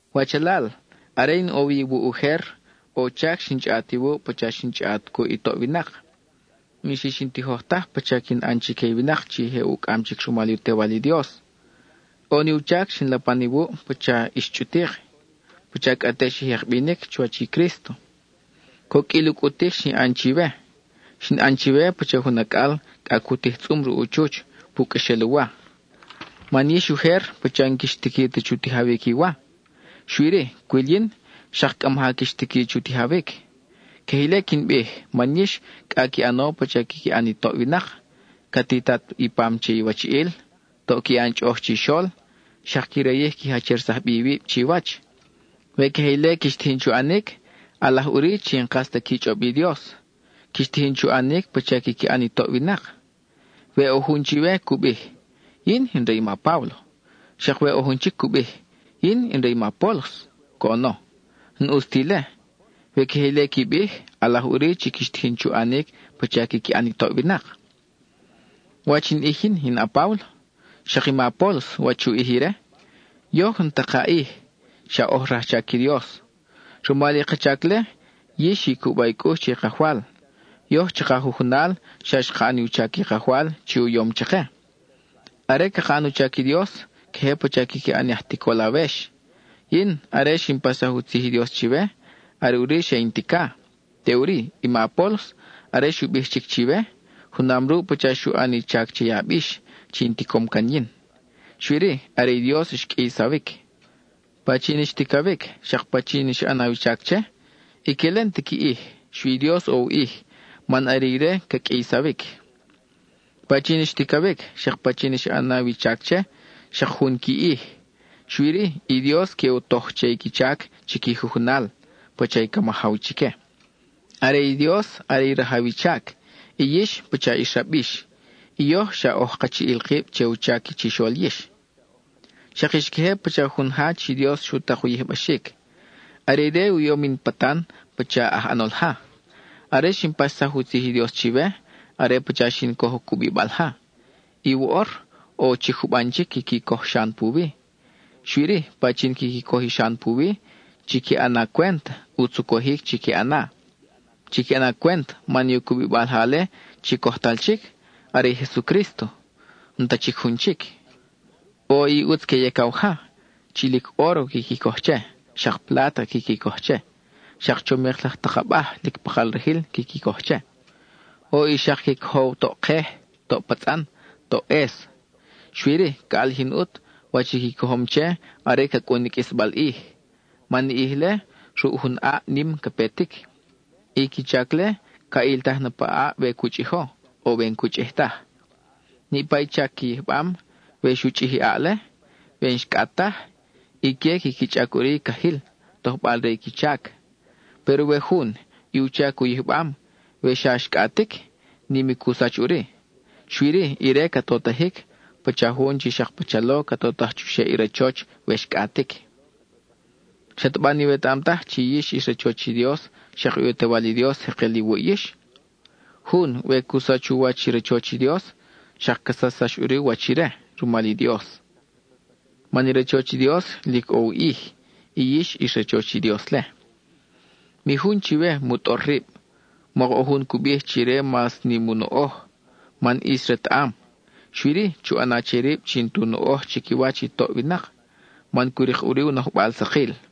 Wachalal, are in ʼo iwuʼ ujer, ʼo u chac xin chʼaʼat iwuʼ pacha xin chʼaʼat cuʼ i toʼ winak. N-xix in tijoj taj pacha quin ʼan chique i winak chi je ucʼam chic rumal u Tewal i Dios. ʼO ni u chac xin lapan iwuʼ pacha xa ix chʼutik, pacha cʼa te xi jek binic chuwach i Crísto. Coqʼuil u cʼutic xin ʼan chiwe. Xin ʼan chiwe pacha jun acʼal cʼa cu tij tzʼum ruʼ u chuch pu qʼuexel u wa; man yix ujer pacha n-quix tiqui ta chu tijawic i wa. Xui-ri, cwil yin, xak cʼa maja quix tiqui chu tijawic. Queje ile quin bij, man yix cʼa qui ʼano pacha quiqui ʼan i toʼ winak: ca titat i pam che iwachiʼil, toʼ qui ʼan chʼoʼoj chixol, xak qui rayij qui jachersaj bi iwib chiwach. We queje ile quix tijin chu ʼanic, ʼalaj ʼuri chi n-kas ta qui chʼob i Dios; quix tijin chu ʼanic pacha quiqui ʼan i toʼ winak. We ʼo jun chiwe cu bij: “Yin in re i ma Páblo,” xak we ʼo jun chic cu bij: “Yin in re i ma Apólos,” coʼono, n-ʼus ta ile. We queje ile qui bij, ʼalaj ʼuri chi quix tijin chu ʼanic pacha quiqui ʼan i toʼ winak. ¿Wach in ʼij yin, in a-Páblo? Xak i ma Apólos, ¿wach u ʼij ire? Yoj n-ta ka ʼij; xa oj rajchac i Dios. Rumal i ka chac-le, yix xi cuba i cʼux che i Kajwal; yoj chaka jujunal xa xka ʼan i u chac i Kajwal chi u yom chake. Are caka ʼan u chac i Dios, queje pacha quiqui ʼan aj ticol awex. Yin, are xin paxsaj u tzij i Dios chiwe, are ʼuri xe in tica. Teʼuri, i ma Apólos, are xu bij chic chiwe, junam ruʼ pacha xu ʼan i chac che i abix chi in ticom can yin; xui-ri, are i Dios xqʼuiysawic. Pachin i xticawic, xak pachin i xa ʼanaw i chac che, ique-le n-ta qui ʼij; xui i Dios ʼo u ʼij, man are ire chi ca qʼuiysawic. Pachin i xticawic, xak pachin i xa ʼanaw i chac che, xak jun qui ʼij, xui-ri, i Dios que u toj che i qui chac chi qui jujunal, pacha i ca majaw chique. Are i Dios are i rajaw i chac; i yix, pacha ix rabix; i yoj xa oj kachiʼil kib che u chac chixol yix. Xak ix queje pacha jun ja chi Dios xu tak u yijbaxic. Are ire u yom in patan pacha aj ʼanol ja. Are xin paxsaj u tzij i Dios chiwe, are pacha xin coj i cubibal ja; y woʼor, ʼo chic juban chic quiqui coj xan puwi. Xui-ri, pachin quiqui coj i xan puwi, chiqui ʼana cwent, ʼutz u cojic chiqui ʼana. Chiqui ʼana cwent, man i u cubibal ja-le chi cojtal chic, are i Jesucrísto; n-ta chic jun chic. ʼO i ʼutz que yacaw ja, chi lic óro quiqui coj che, xak pláta quiqui coj che, xak chomik laj tak abaj lic pakal rajil quiqui coj che. ʼO i xak que cojow toʼ kej, toʼ patzʼan, toʼ ʼes. Xui-ri, ca ʼalijin ʼut wach i qui cojom che are ca cʼun i qʼuisbal ʼij, man i ʼij-le, ruʼ jun ʼaʼ nim ca petic. I qui chac-le, ca ʼiltaj na pa ʼaʼ we cu chʼijo, o we n-cu chʼij taj. Niʼpa i chac qui yijbam, we xu chʼij i ʼaʼ-le, we nxcʼat taj, ique quiqui chʼac ʼuri i cajil, tojbal re i qui chac. Péro we jun, i u chac u yijbam, we xa xcʼatic, nim i cu sach ʼuri; xui-ri, ire ca totajic, pacha jun chi xak pachalo ca totaj chuxeʼ i rachoch we xcʼatic. ¿Xataba n-iwetaʼam taj chi yix ix rachoch i Dios, xak i u Tewal i Dios jekel iwuʼ yix? Jun, we cu sach u wach i rachoch i Dios, xak ca sachsax ʼuri u wach ire rumal i Dios. Man i rachoch i Dios, lic ʼo u ʼij; y yix ix rachoch i Dios-le. Mi jun chiwe mu tʼor rib. Mok ʼo jun cu bij chi ire mas nim u noʼoj, man ʼis retaʼam; xui-ri, chu ʼana che rib chi n-tu noʼoj chiquiwach i toʼ winak, man cu rik ʼuri u nojbal sakil.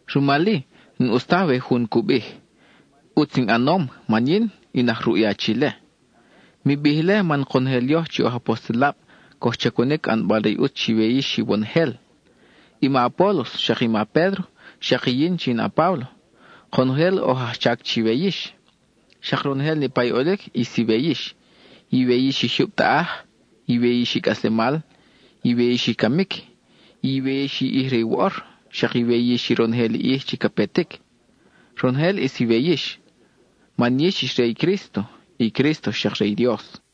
Rumal-i, n-ʼus taj we jun cu bij: “ʼUtz in ʼanom man yin in aj ruʼ i achi-le.” Mi bij ile man konojel yoj chi oj apostelab coj chacunic ʼanbal re i ʼutz chiwe yix iwonojel. I ma Apólos, xak i ma Pédro, xak i yin chi in a-Páblo, konojel oj aj chac chiwe yix. Xak ronojel niʼpa i ʼolic ʼis iwe yix; iwe yix i jyub taʼaj, iwe yix i cʼaslemal, iwe yix i camic, iwe yix i ʼij re woʼor, xak iwe yix i ronojel ʼij chi ca petic. Ronojel ʼis iwe yix, man yix ix re i Crísto; i Crísto xak re i Dios.